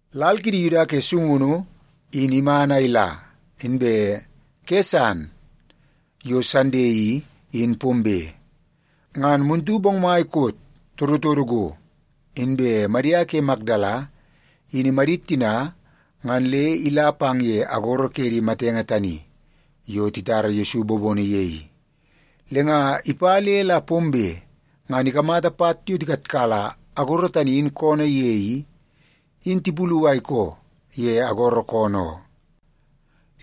Lal kidi Yuda ke sungunu in iman a ila, inbe ke san yo Sande i, in pombe. Ngan muntu bongmai koot todotodo go, inbe Madia ke Makdala in imadit tina ngan le ila pang ye agoro ke di matenge tani yo titara Yesu bobono ye i. Le nga ipa le la pombe ngan ikamata pat yo tikatkala agoro tani in koonoo ye i, in tipulu a ikoo ye agoro koonoo oo.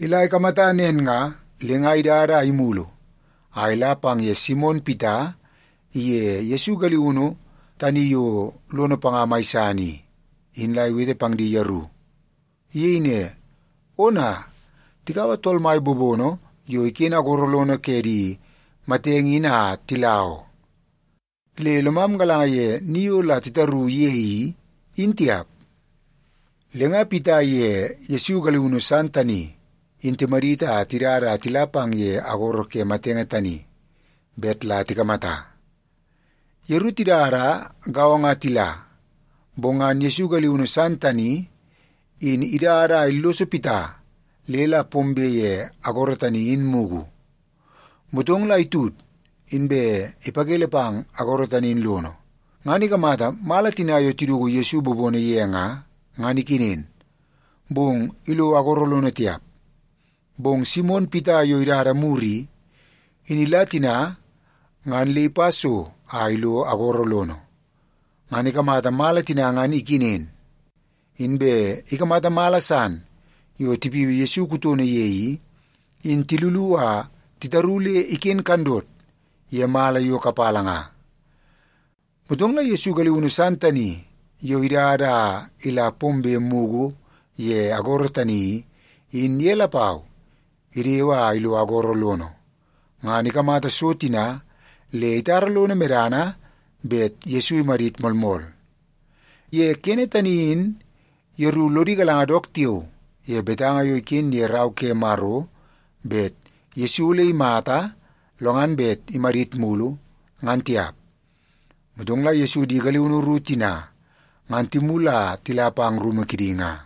Ila ikamata nen nga, le nga idada a imulu a ila pang ye Simon Pita iye Yesu galiunu tani yo lono panga mai san i, in la iwete pang di yeru. Iyei ne, “Ona, tikaua Tool Mai bobono yo iken agoro lono ke di matenge in a tila oo. Le lomam galanga ye ni yo la titaru ye i, in tiap.” Le nga Pita iye Yesu galiunu san tani in timadit a tidada a tila pang ye agoro ke di matenge tani bet la tikamata. Yeru tidada gaongo a tila, bong ngan Yesu galiunu san tani in idada a illoso Pita le la pombe ye agoro tani in mugu. Motong la itud, inbe ipakele pang agoro tani in lono, ngan ikamata mala tina yo tiduku Yesu bobono ye nga, ngan ikenen, bong ilo agoro lono tiap. Bong Simon Pita yo idada mur i, in ila tina ngan le ipa so a ilo agoro lono. Ngan ikamata mala tina ngan ikenen, inbe ikamata mala san yo tipiui Yesu kutono ye i, in tilulu a titaru le iken kandot ye mala yo kapala nga. Motong la Yesu galiunu san tani yo idada a ila pombe mugu ye agoro tani i, in ye lapau idewe a ilo agoro lono. Ngan ikamata so tina le itara lono medana bet Yesu imadit moolmool. (Ye kene tani in yeru lodi galanga dook tiao ye betanga yo iken ye Rau ke Maro bet Yesu ole imata lo ngan bet imadit mulu, ngan tiap.) Motong la Yesu di galiunu ru tina ngan timulu a tila pang rumu kidi nga.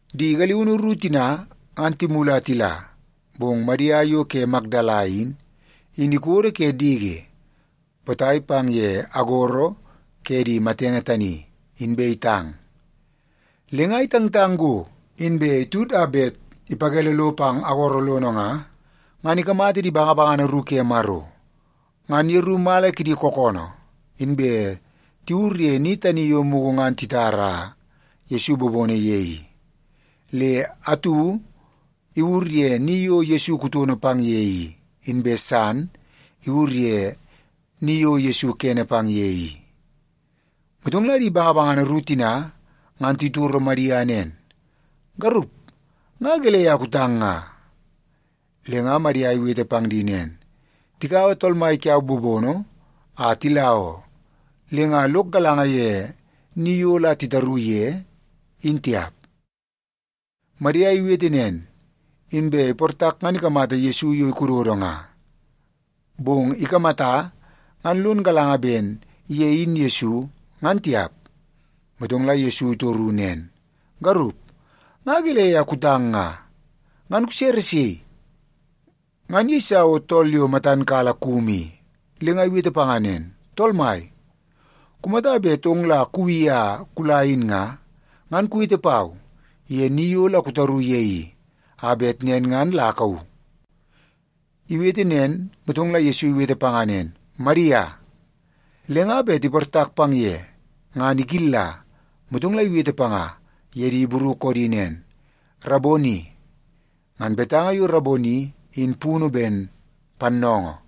Di galiunu ru tina ngan timulu a tila, bong Madia yo ke Makdala i, in ikodo ke diki potai pang ye agoro ke di matenge tani, inbe itang. Le nga itangtang go, inbe itud a bet ipakele lo pang agoro lono nga, ngan ikamata di bangabangana ru ke Maro. Ngan yeru mala kidi kookoonoo, inbe tiwur ye ni tani yo mugu ngan titara Yesu bobono ye i. Le atu iwur ye ni yo Yesu kutono pang ye i, inbe san iwur ye ni yo Yesu kene pang ye i. Motong la di bangabangana ru tina ngan titoro Madia nen, “Garup, nga gelei a kutang nga?” Le nga Madia iwete pang di nen, “Tikaua Tool Mai kiau bobono a tila oo, le nga lok galanga ye ni yo la titaru ye, in tiap.” Madia iwete nen, inbe iportak ngan ikamata Yesu yo ikododo nga. Bong ikamata ngan lon galanga ben ye in Yesu, ngan tiap. Motong la Yesu itoru nen, “Garup, nga gelei a kutang nga? Ngan kusere sei?” Ngan iyeisa o tool yo matan kala kumu i, le nga iwete panga nen, “Tool mai, kumata bet ong la kuwi a kula in nga, ngan kuwete pau ye ni yo la kutaru ye i, a bet nen ngan la akauu.” Iwete nen, motong la Yesu iwete panga nen, “Madia.” Le nga bet iportak pang ye ngan ikilla, motong la iwete panga ye di Ibru koodi nen, “Raboni!” (Ngan betanga yo Raboni in punu ben Pannoongoo.)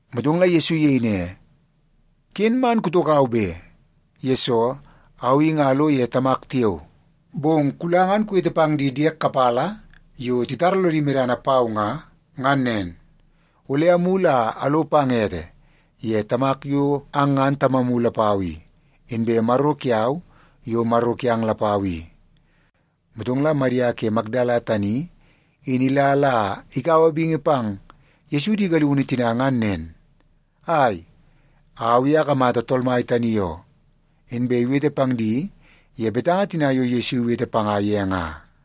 Motong la Yesu iyei ne, “Ken man kutokau be, yesoo au i nga alo ye Tamak tiao. Bong kula ngan kuwete pang di diek kapala yo titara lodi medana pau nga, ngan nen, ‘Ole amulu a alo pang ete ye Tamak yo ang ngan Tamamu lapau i, inbe Maro kiau yo Maro kiang lapau i.’” Motong la Madia ke Makdala tani in ila la ikaua bingi pang Yesu di galiunu tina ngan nen, “Ai, au i akamata Tool Mai tani oo!” Inbe iwete pang di ye betanga tina yo Yesu iwete panga ye nga.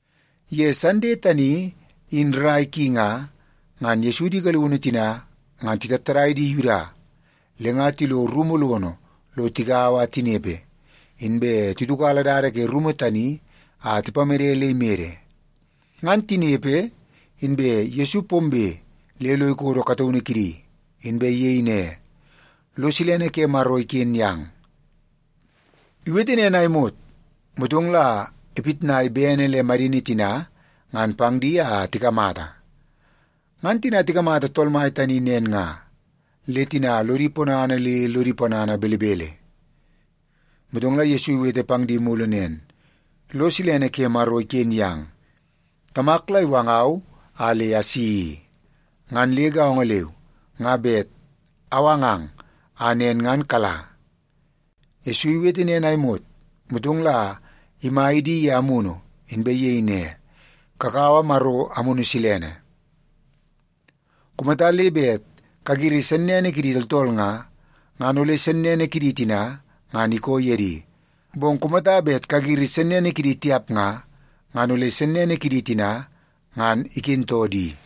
Ye Sande tani in rrai ki nga, ngan Yesu di galiunu tina ngan titattadai di Yuda, le nga tilo rumu lono lo tigaua a tinepe, inbe titiukala dada ke rumu tani a tipamede le imede. Ngan tinepe, inbe Yesu pombe le lo ikodo kataunu kidi, inbe iyei ne, “Lo silene ke Maro iken yang.” Iwete nen a imot, motong la ipitnai bene le madini tina ngan pang di a tikamata. Ngan tina tikamata Tool Mai tani nen nga, le tina lodi ponana le lodi ponana belebele. Motong la Yesu iwete pang di mulu nen, “Lo silene ke Maro iken yang. Tamak la iwangau a le asi i. Ngan le gaongo leu, nga bet awangang a nen ngan kala.” Yesu iwete nen a imot, motong la imai di ye amunu, inbe iyei ne, “Kakaua Maro Amunu Silene. Kumata le bet kagiri sennene kidi tooltool nga, ngan ole sennene kidi tina ngan ikoo ye di. Bong kumata bet kagiri sennene kidi tiap nga, ngan ole sennene kidi tina ngan ikentoo di.”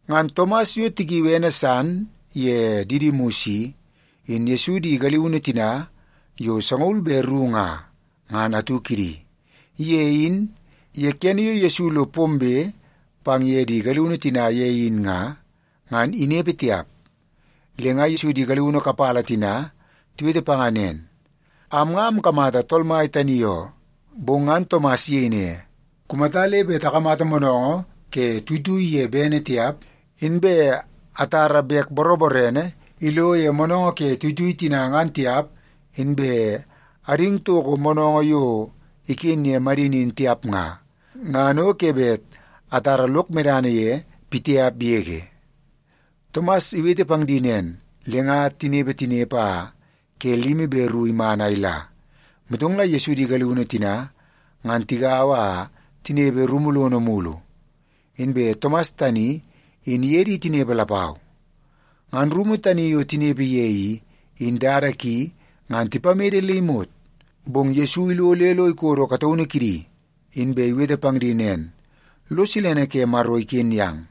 Ngan Tomas yo tikiui ene san ye Didimus i, in Yesu di galiunu tina yo sangaul be ru nga, ngan atu kidi. Ye in, ye kene yo Yesu lo pombe pang ye di galiunu tina ye in nga, ngan inepe tiap. Le nga Yesu di galiunu kapala tina tiwete panga nen, “Am nga amkamata Tool Mai tani oo.” Bong ngan Tomas iyei ne, “Kumata le bet akamata moonoongoo ke tuitui ye bene tiap, inbe atara bek boroborene ilo ye moonoongoo ke tuitui tina ngan tiap inbe ading toko moonoongoo yo iken ke madini in tiap nga, ngan o ke bet atara lok medana ye pitiap yege.” Tomas iwete pang di nen, le nga tinepe tinepe a ke limi be ru iman a ila, motong la Yesu di galiunu tina ngan tigaua a tinepe rumu lono mulu. Inbe Tomas tani in iye di tinepe lapau. Ngan rumu tani yo tinepe ye i, in dada ki ngan tipamede le imot, bong Yesu ilo le lo ikodo kataunu kidi, inbe iwete pang di nen, “Lo silene ke Maro iken yang.”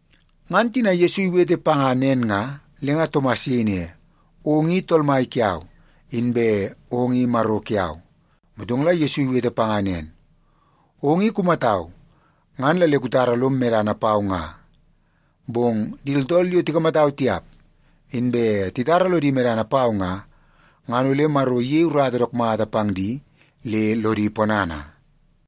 Ngan tina Yesu iwete panga nen nga, le nga Tomas iyei ne, “Ong i Tool Mai kiau, inbe ong i Maro kiau.” Motong la Yesu iwete panga nen, “Ong i kumatau, ngan la le kutara lom medana pau nga. Bong di tooltool yo tikamatau tiap, inbe titara lodi medana pau nga, ngan ole Maro iyei urata dook mata pang di le lodi ponana.”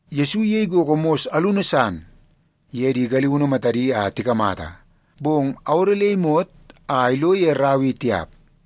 Yesu iyei gogo mos alunu san ye di galiunu matadi a tikamata, bong awodo le imot a ilo ye rau i tiap.